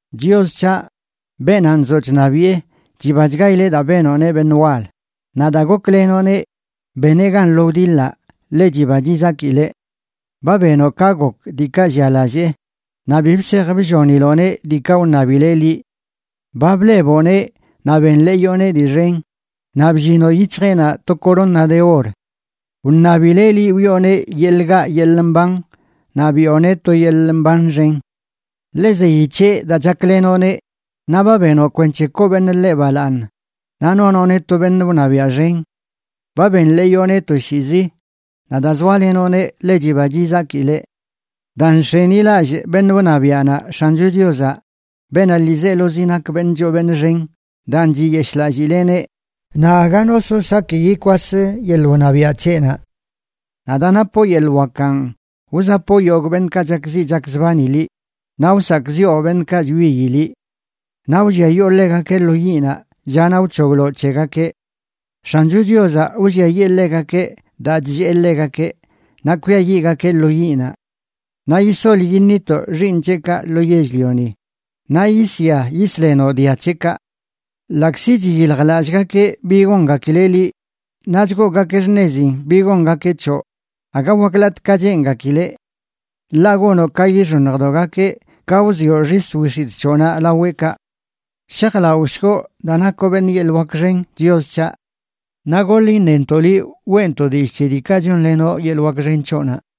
Chios c̱haꞌ, beenaꞌ nzoꞌ chṉabiꞌe chibachgaileꞌ daa benoꞌneꞌ beṉꞌ wal; naꞌ daa goklenoꞌneꞌ beneꞌ gan lo wdiḻaꞌ ḻe chiba chizakileꞌ. Ba benoꞌ ka gok diikaꞌ llialallee, naꞌ bi bsej blloniloꞌneꞌ diikaꞌ wṉabileꞌ liꞌ. Ba bleboꞌneꞌ naꞌ benḻeeyoꞌneꞌ dii xen; naꞌ bllinoꞌ yic̱hjeꞌnaꞌ to corona de or. Wṉabileꞌ liꞌ wiꞌoneꞌ yeḻꞌ gaꞌ yeḻꞌ mban, naꞌ biꞌoneꞌ to yeḻꞌ mban xen. Ḻe zeyi c̱heꞌ daa chaklenoꞌneꞌ, naꞌ ba benoꞌ kwenc̱he koo beṉꞌ ḻeꞌ balaaṉ naꞌ nonoꞌneꞌ to beṉꞌ wṉabiaꞌ xen. Ba benḻeeyoꞌneꞌ toshiizi, naꞌ daa zoalenoꞌneꞌ ḻe chiba chizakileꞌ. Daa nx̱enilallꞌ beṉꞌ wṉabiaꞌnaꞌ X̱ancho Chiozaꞌ, beenaꞌ ḻiizelozi nak beṉꞌ choo beṉꞌ xen, daan chiyeshꞌlallileꞌneꞌ, naꞌ aga no so saki yikwas yeḻꞌ wṉabiaꞌ c̱heꞌnaꞌ. Naꞌ daa napoꞌ yeḻꞌ wakanꞌ, wzapoꞌ yogꞌ beṉꞌkaꞌ chakziꞌ chakzbani liꞌ, naꞌ wsakꞌziꞌo beṉꞌkaꞌ chwiyi liꞌ. Naꞌ wlliayoo ḻegakeꞌ lo yiꞌnaꞌ llanaꞌ wc̱hogloꞌ c̱hegakeꞌ. X̱ancho Chiozaꞌ wlliayee ḻegakeꞌ daa chllee ḻegakeꞌ, naꞌ kwiayiꞌgakeꞌ lo yiꞌnaꞌ. Naꞌ yisol yiṉitoꞌ xiiṉ c̱heꞌkaꞌ lo yell-lioni, naꞌ yisya yisḻenoꞌ dia c̱heꞌkaꞌ. Ḻaꞌkzi chiyiljlallꞌgakeꞌ bi gongakileꞌ liꞌ naꞌ chgoogakeꞌ xṉezin bi gongakeꞌ c̱hoꞌ, aga waklatꞌ ka cheengakileꞌ. Ḻaꞌ gonoꞌ ka yixoṉjdogakeꞌ ka wzioꞌ xis wix̱itꞌ c̱hoꞌnaꞌ laweꞌkaꞌ. Shajlaꞌoshgoꞌ daa nakoꞌ beṉꞌ yeḻꞌ wak xen, Chios c̱haꞌ. Naꞌ goḻ iṉentoꞌ liꞌ, weꞌntoꞌ dillꞌ c̱he diikaꞌ chonlenoꞌ yeḻꞌ wak xen c̱hoꞌnaꞌ.